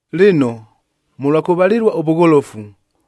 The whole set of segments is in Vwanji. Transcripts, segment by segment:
Lɨno, mʉlwa kʉvalɨlua ʉvʉgholofu,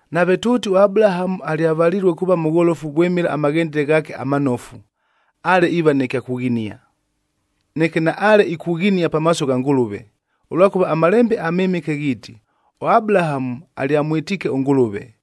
Nave tʉʉti ʉAbulahamu alyavalilue kuuva mʉgholofu vwɨmɨla amaghendele ghaake amanofu, ale iiva nɨ kya kughinia. Neke naale ikughinia pamaaso gha Ngʉlʉve, ʉlwakʉva aMalembe aMɨmɨke ghiiti, “ɄAbulahamu alyamwɨtiike ʉNgʉlʉve,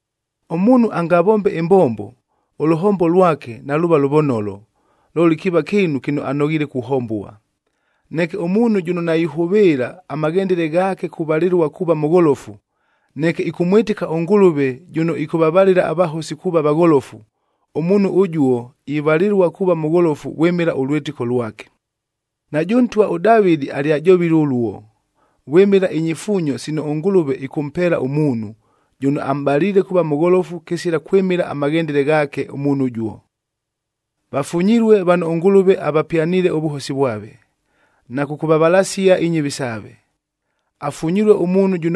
Ʉmuunhu angavombe ɨmbombo, ʉlʉhombo lwake naluuva lʉvonolo, looli kiiva kɨɨnu kɨno anoghiile kuhombua. Neke ʉmuunhu jʉno naihʉvɨɨla amaghendele ghaake kuvalɨlua kuuva mʉgholofu, neke ɨkʉmwɨtɨka ʉNgʉlʉve jʉno ɨkʉvavalɨla avahosi kuuva vagholofu, ʉmuunhu ʉjuo ivalɨlua kuuva mʉgholofu vwɨmɨla ʉlwɨtɨko lwake. Najʉ ntwa ʉDavɨdi alyajovile ʉluo, vwɨmɨla inyifuunyo sino ʉNgʉlʉve ɨkʉmpeela ʉmuunhu, jʉno amʼbaliile kuuva mʉgholofu kɨsila kwɨmɨla amaghendele ghaake ʉmuunhu ʉjuo, “Vafunyilue vano ʉNgʉlʉve avapyaniile ʉvʉhosi vwave, na kʉkʉvavalasia inyɨvi saave. Afunyilue ʉmuunhu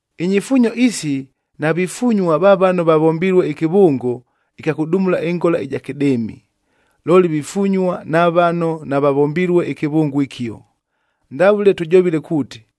Inyifuunyo isi navifunyua va vano vavombilue ɨkɨvʉngo ɨkya kʉdumula ɨngola ɨja kɨdɨɨmi, looli vifunyua na vano navavombilue ɨkɨvʉngo ɨkio, ndavʉle tʉjovile kuuti,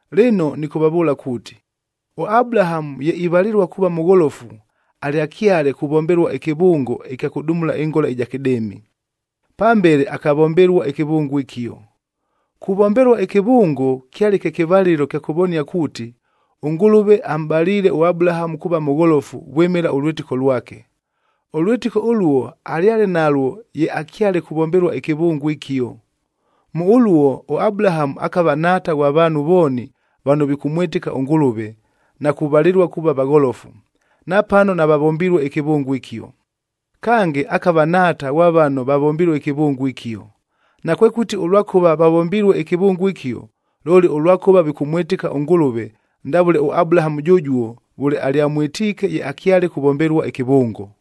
Lɨno nɨkʉvavʉʉla kuuti, ʉAbulahamu ye ivalɨlua kuuva mʉgholofu alyakyale kuvombelua ɨkɨvʉngo ɨkya kʉdumulua ɨngola ɨja kɨdɨɨmi. Pambele akavombelua ɨkɨvʉngo ɨkio. Kuvombelua ɨkɨvʉngo kyale kye kɨvalɨlo kya kʉvonia kuuti, ʉNgʉlʉve amʼbaliile ʉAbulahamu kuuva mʉgholofu vwɨmɨla ʉlwɨtɨko lwake. Ʉlwɨtɨko ʉluo alyale nalwo ye akyale kuvombelua ɨkɨvʉngo ɨkio. Mʉ ʉluo ʉAbulahamu akava nhaata ghwa vaanhu vooni vano vikʉmwɨtɨka ʉNgʉlʉve, na kuvalɨlua kuuva vagholofu, napano navavombilue ɨkɨvʉngo ɨkio. Kange, akava nhaata ghwa vano vavombilue ɨkɨvʉngo ɨkio, nakwekʉti ʉlwakʉva vavombilue ɨkɨvʉngo ɨkio, looli ʉlwakʉva vikʉmwɨtɨka ʉNgʉlʉve ndavʉle ʉAbulahamu jʉjuo vʉle alyamwɨtiike ye akyale kuvombelua ɨkɨvʉngo.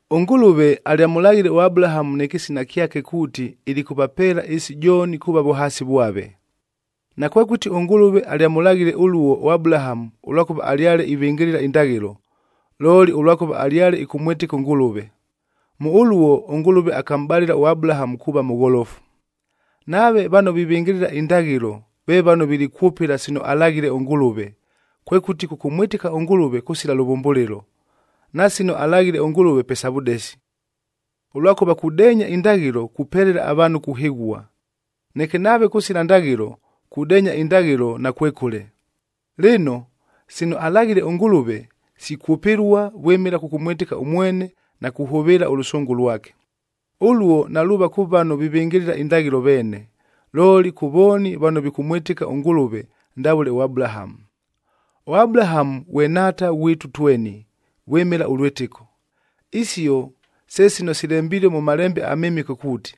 ɄNgʉlʉve alyamʉlaghile ʉAbulahamu nɨ kɨsina kyake kuuti ilikʉvapeela ɨɨsi jooni kuuva vʉhaasi vwave.e Nakwekʉti ʉNgʉlʉve alyamʉlaghile ʉluo ʉAbulahamu ʉlwakʉva alyale ivɨngɨlɨla indaghɨlo, looli ʉlwakʉva alyale ɨkʉmwɨtɨka ʉNgʉlʉve. Mʉ ʉluo, ʉNgʉlʉve akamʼbalɨla ʉAbulahamu kuuva mʉgholofu. Nave vano vivɨngɨlɨla indaghɨlo ve vano vilikwʉpɨla sino alaghile ʉNgʉlʉve, kwekʉti kʉkʉmwɨtɨka ʉNgʉlʉve kʉsila lʉvʉmbʉlɨlo, na sino alaghile ʉNgʉlʉve pe sa vʉdesi. Ʉlwakʉva kudeenya indaghɨlo kupelela avaanhu kuhɨghua. Neke nave kʉsila ndaghɨlo, kudeenya indaghɨlo nakwekʉle. Lɨno, sino alaghile ʉNgʉlʉve sikwʉpɨlua vwɨmɨla kʉkʉmwɨtɨka ʉmwene na kuhʉvɨɨla ʉlʉsʉngʉ lwake. Ʉluo naluuva kʉ vano vivɨngɨlɨla indaghɨlo veene, looli kʉ vooni vano vikʉmwɨtɨka ʉNgʉlʉve ndavʉle ʉAbulahamu. ɄAbulahamu ghwe nhaata ghwitu tweni vwɨmɨla ʉlwɨtɨko. Isio se sino silembilue mʉ Malembe aMɨmɨke kuuti,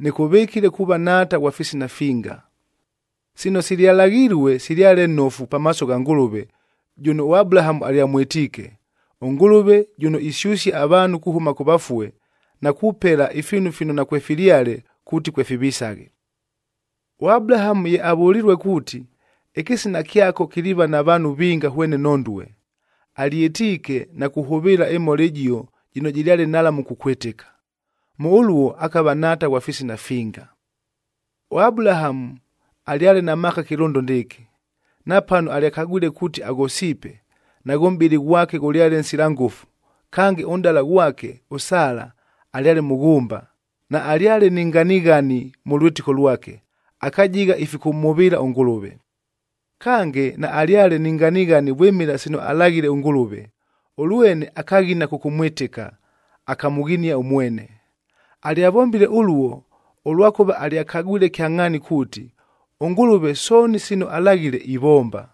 “Nɨkʉvɨkile kuuva nhaata ghwa fisina finga.”f Sino silyalaghilue silyale nofu pamaaso gha Ngʉlʉve jʉno ʉAbulahamu alyamwɨtiike, ʉNgʉlʉve jʉno isyʉsia avaanhu kuhʉma kʉ vafue na kupela ifiinu fino nakwefilyale kuuti kwefivisaghe. ɄAbulahamu ye avʉlilue kuuti, “Ɨkɨsina kyako kiliiva na vaanhu vinga hwene nhondue,”g alyɨtiike na kuhʉvɨɨla ɨmhola ɨjio jɨno jɨlyale nhalamu kukwɨtɨka. Mʉ ʉluo akava nhaata ghwa fisina finga. ɄAbulahamu alyale na maaka kɨlʉndo ndɨɨkɨ. Napano alyakagwile kuuti aghosiipe, naghʉ mʼbɨlɨ ghwake ghʉlyale nsila ngʉfu, kange ʉnʼdala ghwake ʉSala alyale mʉghʉmba, naalyale ni nganighani mʉ lwɨtɨko lwake, akajigha ifikʉmhʉvɨɨla ʉNgʉlʉve. Kange, naalyale ni nganighani vwɨmɨla sino alaghile ʉNgʉlʉve, ʉlwene akaghina kʉkʉmwɨtɨka, akamʉghinia ʉmwene. Alyavombile ʉluo, ʉlwakʉva alyakagwile kyangʼhaani kuuti, ʉNgʉlʉve sooni sino alaghile ivomba,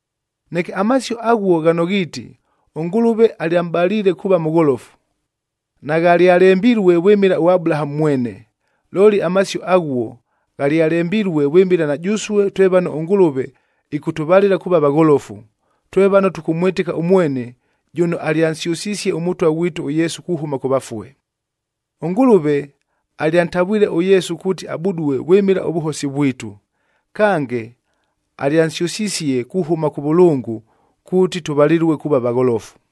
Neke amasio aghuo ghano ghiiti, “ɄNgʉlʉve alyamʼbaliile kuuva mʉgholofu,” naghalyalembilue vwɨmɨla ʉAbulahamu mwene. Looli amasio aghuo ghalyalembilue vwɨmɨla na jʉsue twe vano ʉNgʉlʉve ɨkʉtʉvalɨla kuuva vagholofu, twe vano tʉkʉmwɨtɨka ʉmwene jʉno alyansyʉsisie ʉMʉtwa ghwitu ʉYesu kuhʉma kʉ vafue. ɄNgʉlʉve alyantavwile ʉYesu kuuti abudue vwɨmɨla ʉvʉhosi vwitu, kange alyansyʉsisie kuhʉma kʉvʉlʉngʉi kuuti tʉvalɨlue kuuva vagholofu.